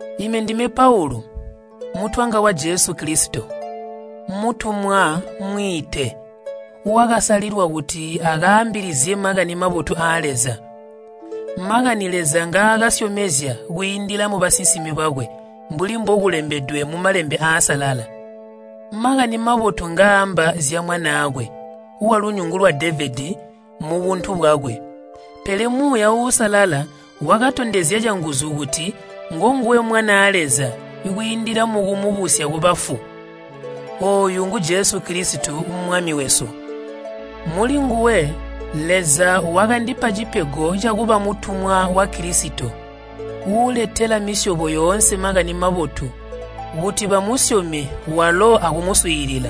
Ime ndime Paulu, mutwanga wa Jesu Kilisito, mutumwa mwiite, wakasalilwa kuti akaambilizye Makani Mabotu aa Leza. Makani Leza ngaakasyomezya kwiindila mubasinsimi bakwe mbuli mbokulembedwe mu Malembe Aasalala. Makani Mabotu ngaaamba zya Mwanaakwe, walunyungu lwa Devedi mubuntu bwakwe. Pele Muuya Uusalala wakatondezya canguzu kuti ngonguwe Mwanaa Leza kwiindila mukumubusya kubafu. Ooyu ngu Jesu Kilisito Mwami wesu. Mulinguwe Leza wakandipa cipego cakuba mutumwa wa Kilisito uuletela misyobo yoonse Makani Mabotu kuti bamusyome walo akumuswiilila.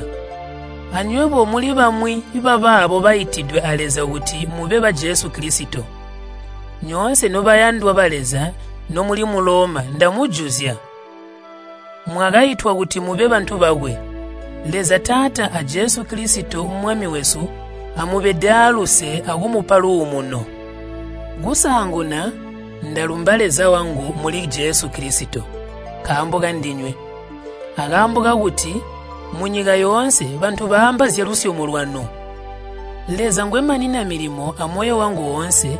Anywebo muli bamwi babaabo baitidwe a Leza kuti mube ba Jesu Kilisito. Nyoonse nobayandwa ba Leza nomuli mu Loma ndamujuzya. Mwakaitwa kuti mube bantu bakwe. Leza Taata a Jesu Kilisito Mwami wesu amubede aaluse akumupa luumuno. Kusaanguna ndalumba Leza wangu muli Jesu Kilisito nkaambo kandinywe, akaambo kakuti munyika yoonse bantu baamba zyalusyomo lwanu. Leza ngwemanina milimo amoyo wangu oonse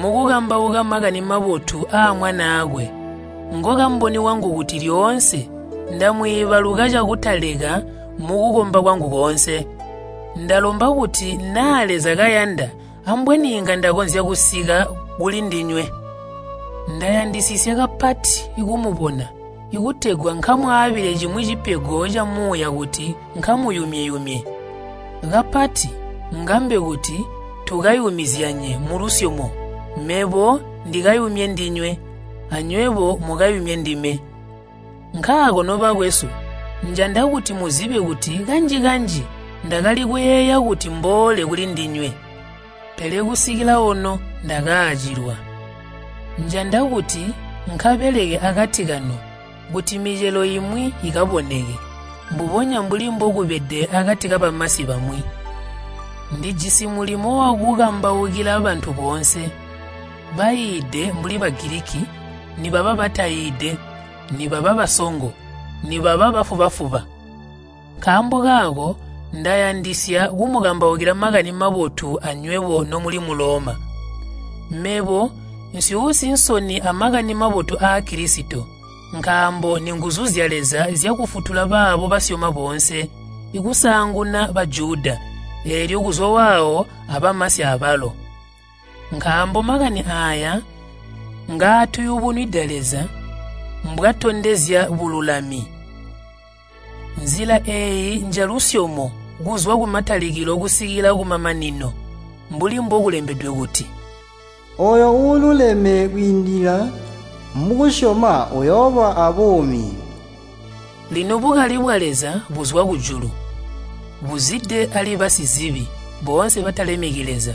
mukukambauka Makani Mabotu aa Mwanaakwe, ngokamboni wangu kuti lyoonse ndamwiibaluka cakutaleka mukukomba kwangu koonse. Ndalomba kuti naa Leza kayanda ambweni inga ndakonzya kusika kulindinywe. Ndayandisisya kapati kumubona kutegwa nkamwaabile cimwi cipego camuuya kuti nkamuyumye-yumye. Kapati ngambe kuti tukayumizyanye mulusyomo mebo ndikayumye ndinywe anywebo mukayumye ndime. Nkaako nobakwesu, njanda kuti muzibe kuti kanji-kanji ndakali kuyeeya kuti mboole kulindinywe, pele kusikila ono ndakacilwa. Njanda kuti nkabeleke akati kanu kuti micelo imwi ikaboneke, mbubonya mbuli mbokubede akati kabamasi bamwi. Ndijisi mulimo wakukambaukila bantu boonse, baiide mbuli Bagiliki nibaba bataiide, nibaba basongo, nibaba bafuba-fuba. Nkaambo kaako ndayandisya kumukambaukila Makani Mabotu anywebo nomuli mu Loma. Mebo nsyuusi nsoni a Makani Mabotu aa Kilisito, nkaambo ninguzu zya Leza zyakufutula baabo basyoma boonse, kusaanguna Bajuda, eelyo kuzwa waawo abamasi abalo. Nkaambo Makani aaya ngaatuyubunwida Leza mbwatondezya bululami. Nzila eeyi njalusyomo kuzwa kumatalikilo kusikila kumamanino. Mbuli mbokulembedwe kuti, “Ooyo uululeme kwiindila mukusyoma uyooba aabuumi.” Lino bukali bwa Leza buzwa kujulu buzide ali basizibi boonse batalemeki Leza.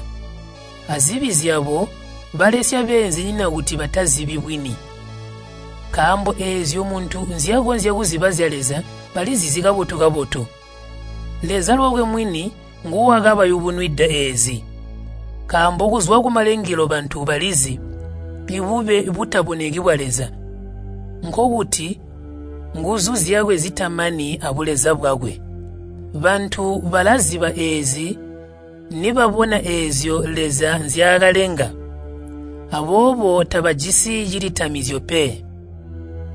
Azibi zyabo balesya beenzinyina kuti batazibi bwini. Nkaambo eezyo muntu nzyakonzya kuziba zya Leza balizizi kabotu-kabotu. Leza lwakwe mwini nguwakabayubunwida eezi. Nkaambo kuzwa kumalengelo bantu balizi bube butaboneki bwa Leza, nkokuti nguzu zyakwe zitamani abuleza bwakwe. Bantu balaziba eezi nibabona eezyo Leza nzyaakalenga. Aboobo tabajisi cilitamizyo pe.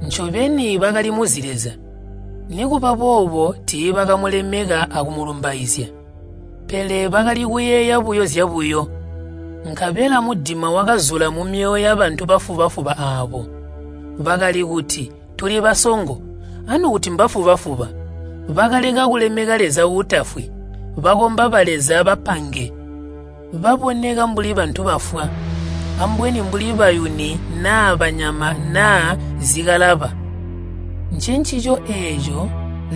Ncobeni bakalimuzi Leza, nikuba boobo tiibakamulemeka akumulumbaizya, pele bakali kuyeeya buyo zyabuyo, nkabela mudima wakazula mumyoyo yabantu bafuba-fuba aabo. Bakali kuti, “Tuli basongo,” anukuti mbafuba-fuba. Bakaleka kulemeka Leza uutafwi, bakomba baleza bapange baboneka mbuli bantu bafwa, ambweni mbuli bayuni naa banyama naa zikalaba. Ncencico eeco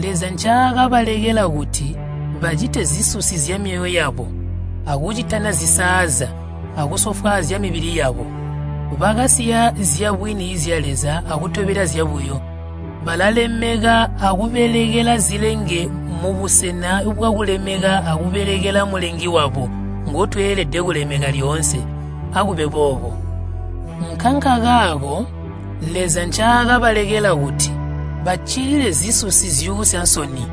Leza ncaakabalekela kuti bacite zisusi zyamyoyo yabo akucitana zisaaza akusofwaazya mibili yabo. Bakasiya zyabwini zya Leza akutobela zyabuyo. Balalemeka akubelekela zilenge mubusena bwakulemeka akubelekela Mulengi walo ngotweelede kulemeka lyoonse. Akube boobo. Nkankakaako Leza ncaakabalekela kuti baccilile zisusi zyuusya nsoni.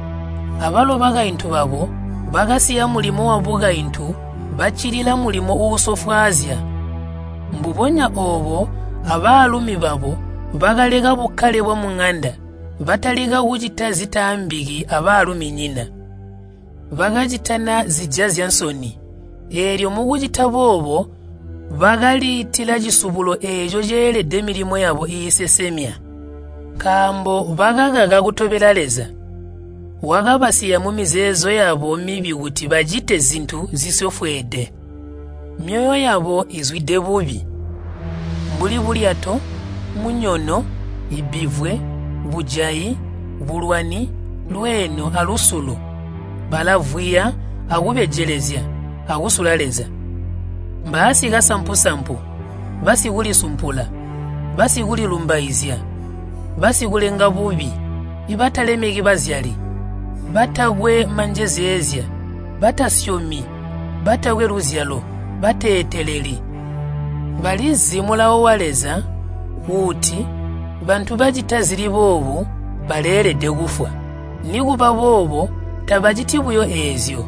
Abalo bakaintu babo bakasiya mulimo wabukaintu baccilila mulimo uusofwaazya. Mbubonya oobo abaalumi babo bakaleka bukkale bwamuŋanda batalika kucita zitaambiki abaaluminyina. Bakacitana zijazya nsoni, eelyo mukucita boobo bakaliitila cisubulo eeco ceelede milimo yabo iisesemya. Nkaambo bakakaka kutobela Leza, wakabasiya mumizeezo yabo mibi kuti bacite zintu zisofweede. Myoyo yabo izwide bubi, mbuli bulyato, munyono, bbivwe, bujayi, bulwani, lweeno, alusulo. Balavwiya, akubejelezya, akusula Leza. Mbaasikasampu-sampu, basikulisumpula, basikulilumbaizya, basikulenga bubi, batalemeki bazyali. Batakwe manjezeezya, batasyomi, batakwe luzyalo, bateeteleli. Balizi mulawo wa Leza uuti bantu bacita zili boobu baleelede kufwa. Nikuba boobo tabaciti buyo eezyo,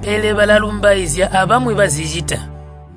pele balalumbaizya abamwi bazicita.